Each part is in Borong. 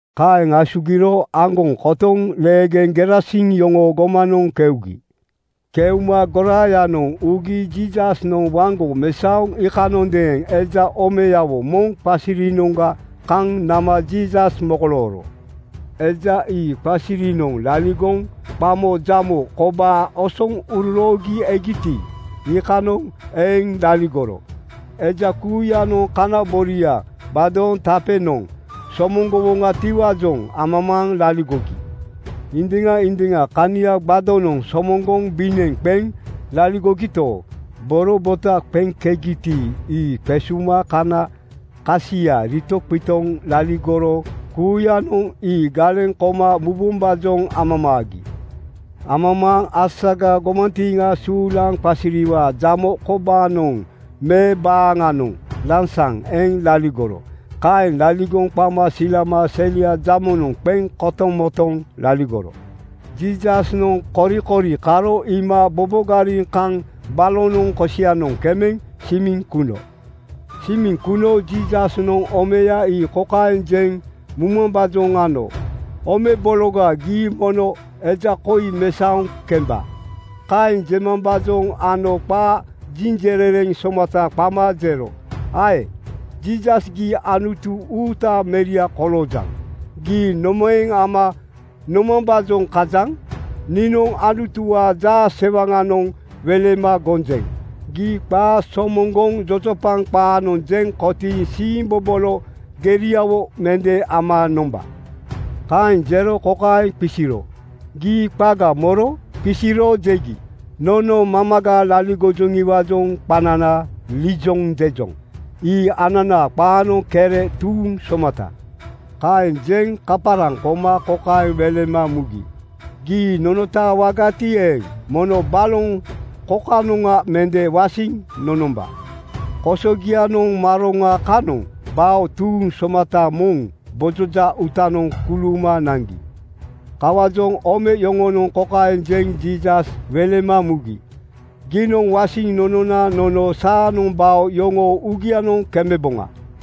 Kaeŋ asugiro aŋgoŋ kotoŋ leegeŋ Gerasin yoŋoo gomanoŋ keugi. Keuma goraayanoŋ ugi Jiisasnoŋ waŋgo mesaoro iikanondeeŋ eja omeyawo moŋ qasirinoŋga kaŋ nama Jiisas mokolooro. Eja ii qasirinoŋ laligoŋ qamo jamo kobaa osoŋ uroroogi egiti, iikanoŋ eŋ laligoro. Eja kuuyanoŋ kanaboria gbado (tape):noŋ somoŋgowoŋatiwaajoŋ amamaaŋ laligogi. Indiŋa indiŋa kania gbadonoŋ somoŋgoŋ bineŋ qeŋ laligogito, boro bota qeŋkegiti, ii qesuma kana kasia ritoqitoŋ laligoro kuuyanoŋ ii galeŋ koma mubombaajoŋ amamaagi. Amamaaŋ asaga gomantiiŋa suulaŋ qasiriwaa jamo kobaanoŋ me baaŋanoŋ lansaŋ eŋ laligoro. Kaeŋ laligoŋ qama silama selia jamonoŋ qeŋ kotomotoŋ laligoro. Jiisasnoŋ korikori karo iima bobogariŋ kaŋ balonoŋ kosianoŋ kemeŋ simiŋ kuno. Simiŋ kuno Jiisasnoŋ omeya ii kokaeŋ jeŋ mumambaajoŋ ano, “Ome bologa, gii mono eja koi mesaoŋ kemba!” Kaeŋ jemambaajoŋ ano qa jinjerereŋ somata qama jero, “Ae! Jiisas, gii Anutu uutaa Meria koloojaŋ. Gii nomaeŋ ama nomambaajoŋ kajaŋ? Niinoŋ Anutuwaa jaasewaŋanoŋ welema gonjeŋ: Gii qaa somoŋgoŋ jojopaŋ qaanoŋ jeŋ kotiiŋ siimbobolo geriawo mende ama nomba.” Kaeŋ jero kokaeŋ qisiro, “Gii qaga moro?” Qisiro jegi, “Nono mamaga laligojoŋiwaajoŋ qanana Liijon jejoŋ.” Ii ananaa qaanoŋ Kere tuuŋ somata. Kaeŋ jeŋ kaparaŋ koma kokaeŋ welema mugi, “Gii nonotaawagati eeŋ, mono baloŋ kokanoŋa mende wasiŋ nonomba.” Kosogianoŋ maroŋa kanoŋ bao tuuŋ somata moŋ gbojoja uutanoŋ kuluuma naŋgi. Kawaajoŋ ome yoŋonoŋ kokaeŋ jeŋ Jiisas welema mugi, “Giinoŋ wasiŋ nonona nono saanoŋ bao yoŋoo uugianoŋ kemeboŋa.”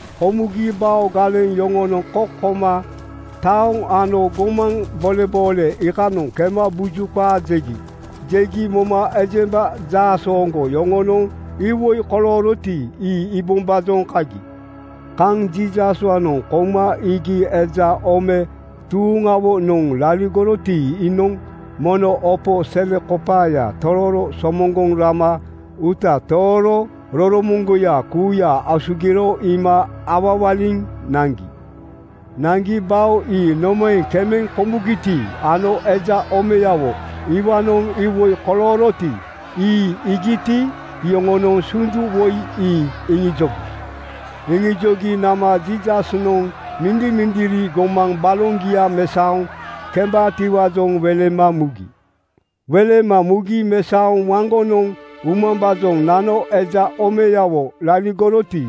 Komugi bao galeŋ yoŋonoŋ kok koma taoŋ ano gomaŋ boleboole iikanoŋ kema buju qaa jegi. Jegi moma ejemba jaasooŋgo yoŋonoŋ iwoi kolooroti, ii iibombaajoŋ kagi. Kaŋ Jiisaswaanoŋ kouma iigi eja ome tuuŋawonoŋ laligoroti, iinoŋ mono opo selekopaaya tororo somoŋgoŋ rama uuta tooro roromoŋgoya kuuya asugiro iima awawaliŋ naŋgi. Naŋgi bao ii nomaeŋ kemeŋ komugiti ano eja omeyawo iwaanoŋ iwoi kolooroti, ii iigiti, iyoŋonoŋ sundu woi ii iŋijogi. Iŋijogi nama Jiisasnoŋ mindimindiri gomaŋ baloŋgia mesaoŋ kembaatiwaajoŋ welema mugi. Welema mugi mesaoŋ waŋgonoŋ umambaajoŋ nano eja omeyawo laligoroti,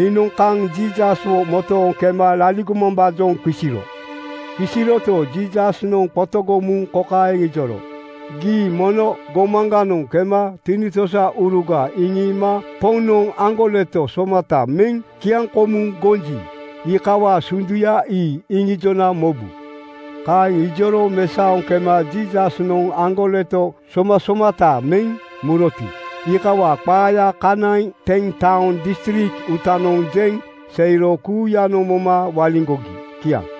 iinoŋ kaŋ Jiisaswo motooŋ kema laligomambaajoŋ qisiro. Qisiroto, Jiisasnoŋ qotogoŋ muŋ kokaeŋ ijoro, “Gii mono gomaŋganoŋ kema tinitosauruga iŋiima Poŋnoŋ aŋgoleto somata meŋ kiaŋkomuŋ gonji, iikawaa sunduya ii iŋijona mobu.” Kaeŋ ijoro mesaoŋ kema Jiisasnoŋ aŋgoleto somasomata meŋ muroti, iikawaa qaaya kanaiŋ Ten-taoŋ distrik uutanoŋ jeŋ seiro kuuyanoŋ moma waliŋgogi. Kiaŋ.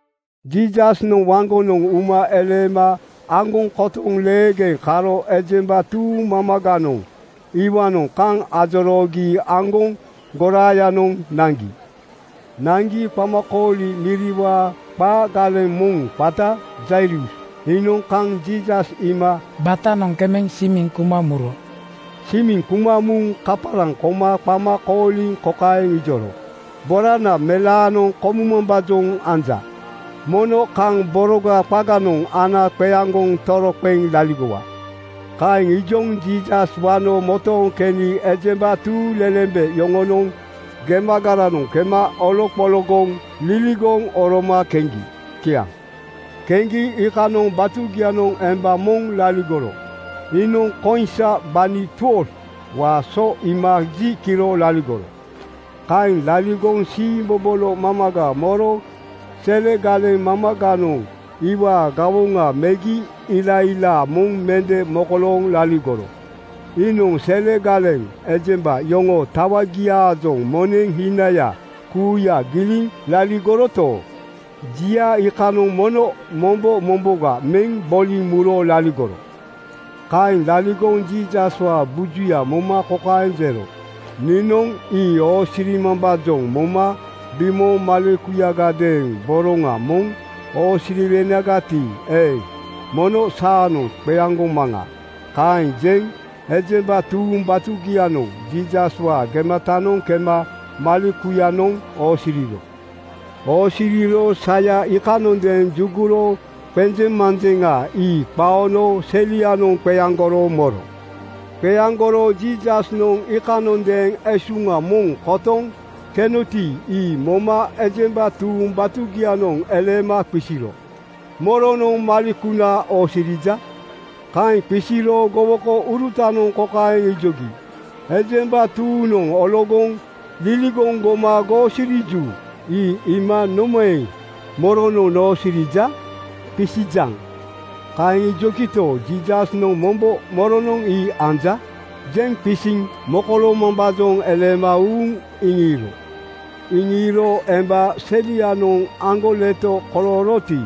Jiisasnoŋ waŋgonoŋ uma eleema aŋgoŋ kotoŋ leegeŋ karo ejemba tuuŋ mamaganoŋ iwaanoŋ kaŋ ajoroogi aŋgoŋ goraayanoŋ naŋgi. Naŋgi qamakooli miriwaa qaa galeŋ moŋ qata Jairus iinoŋ kaŋ Jiisas iima batanoŋ kemeŋ simiŋ kuma muro. Simiŋ kuma muŋ kaparaŋ koma qama kooliŋ kokaeŋ ijoro, “Borana melaanoŋ komumambaajoŋ anja. Mono kaŋ boroga qaganoŋ ana qeaŋgoŋ toroqeŋ laligowa.” Kaeŋ ijoŋ Jiisas wano motooŋ keni ejemba tuuŋlelembe yoŋonoŋ gemagaranoŋ kema oloqologoŋ liligoŋ oroma keŋgi. Kiaŋ. Keŋgi iikanoŋ batugianoŋ emba moŋ laligoro. Iinoŋ koiŋsa gbani 12:waa so iima ji kiro laligoro. Kaeŋ laligoŋ siimbobolo mamaga moro selegaleŋ mamaganoŋ iwaa gawoŋa megi ilailaa moŋ mende mokolooŋ laligoro. Iinoŋ selegaleŋ ejemba yoŋoo tawagiaajoŋ moneŋ hinaya kuuya giliŋ laligoroto, jia iikanoŋ mono mombo momboga meŋ boliŋ muro laligoro. Kaeŋ laligoŋ Jiisaswaa bujuya moma kokaeŋ jero, “Niinoŋ ii oosirimambaajoŋ moma bimooŋ malekuyagadeeŋ boroŋa moŋ oosiriwenagati eeŋ, mono saanoŋ qeaŋgomaŋa.” Kaeŋ jeŋ ejemba tuuŋ batugianoŋ Jiisaswaa gematanoŋ kema malekuyanoŋ oosiriro. Oosiriro saya iikanondeeŋ juguro qenjeŋmanjeŋa ii qaono selianoŋ qeaŋgoro moro. Qeaŋgoro Jiisasnoŋ iikanondeeŋ esuŋa moŋ kotoŋ kenoti, ii moma ejemba tuuŋ batugianoŋ eleema qisiro, “Moronoŋ malekuna oosirija?” Kaeŋ qisiro gowokourutanoŋ kokaeŋ ijogi, “Ejemba tuuŋnoŋ ologoŋ liligoŋ goma goosiriju. Ii iima nomaeŋ ‘Moronoŋ noosirija?’ qisijaŋ?” Kaeŋ ijogito, Jiisasnoŋ mombo “Moronoŋ ii anja?” jeŋ qisiŋ mokoloomambaajoŋ eleema uuŋ iŋiiro. Iŋiiro emba selianoŋ aŋgoleto kolooroti,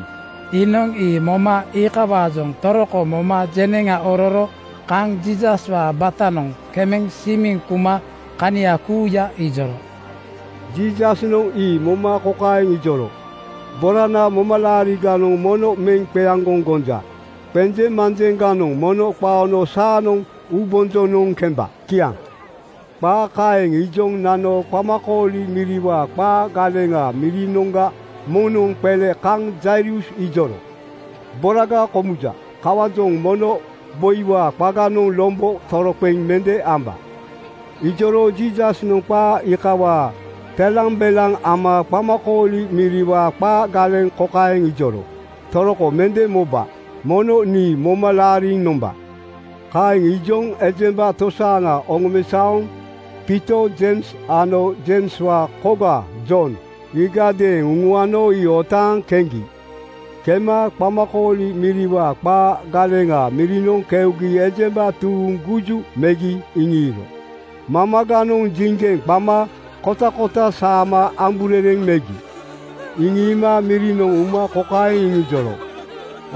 iinoŋ ii moma iikawaajoŋ toroko moma jeneŋa ororo kaŋ Jiisaswaa batanoŋ kemeŋ simiŋ kuma kania kuuya ijoro. Jiisasnoŋ ii moma kokaeŋ ijoro, “Borana, momalaariganoŋ mono meŋ qeaŋgoŋ gonja. Qenjeŋmanjeŋganoŋ mono qaono saanoŋ uubonjonoŋ kemba.” Kiaŋ. Qaa kaeŋ ijoŋ nano qamakooli miriwaa qaa galeŋaa mirinoŋga moŋnoŋ qele kaŋ Jairus ijoro, “Boraga komuja! Kawaajoŋ mono boiwaa qaganoŋ lombo toroqeŋ mende amba.” Ijoro Jiisasnoŋ qaa iikawaa telambelaŋ ama qamakooli miriwaa qaa galeŋ kokaeŋ ijoro, “Toroko mende moba. Mono nii moma laariŋ nomba.” Kaeŋ ijoŋ ejemba tosaaŋa oŋomesaoŋ Piito, Jeims ano Jeimswaa koga Jon iigadeeŋ uŋuano ii otaaŋ keŋgi. Kema qamakooli miriwaa qaa galeŋaa mirinoŋ keugi ejemba tuuŋ guju megi iŋiiro. Mamaganoŋ jiŋgeŋ qama kotakota saama amburereŋ megi. Iŋiima mirinoŋ uma kokaeŋ iŋijoro,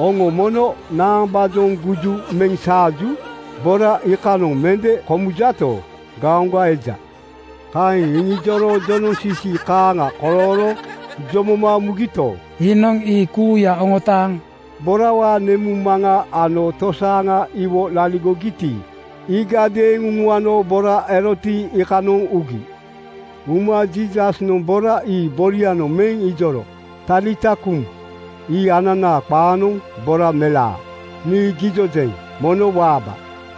“Oŋo mono naambaajoŋ guju meŋ saaju? Bora iikanoŋ mende komujato, gaoŋga eja.” Kaeŋ iŋijoro jonoŋsisi kaaŋa kolooro jomoma mugito, iinoŋ ii kuuya oŋotaaŋ borawaa nemuŋmaŋa ano tosaaŋa iwo laligogiti, iigadeeŋ uŋuano bora eroti, iikanoŋ ugi. Uma Jiisasnoŋ bora ii borianoŋ meŋ ijoro, “Talita kuum.” Ii ananaa qaanoŋ Bora melaa, nii gijojeŋ: Mono waaba!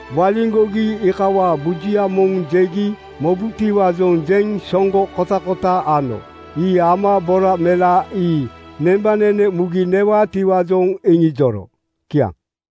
Waliŋgogi iikawaa bujuya moŋ jegi mobubotiwaajoŋ jeŋ soŋgo kotakota ano. Ii ama bora melaa ii nembanene mugi newaatijoŋ iŋijoro. Kiaŋ.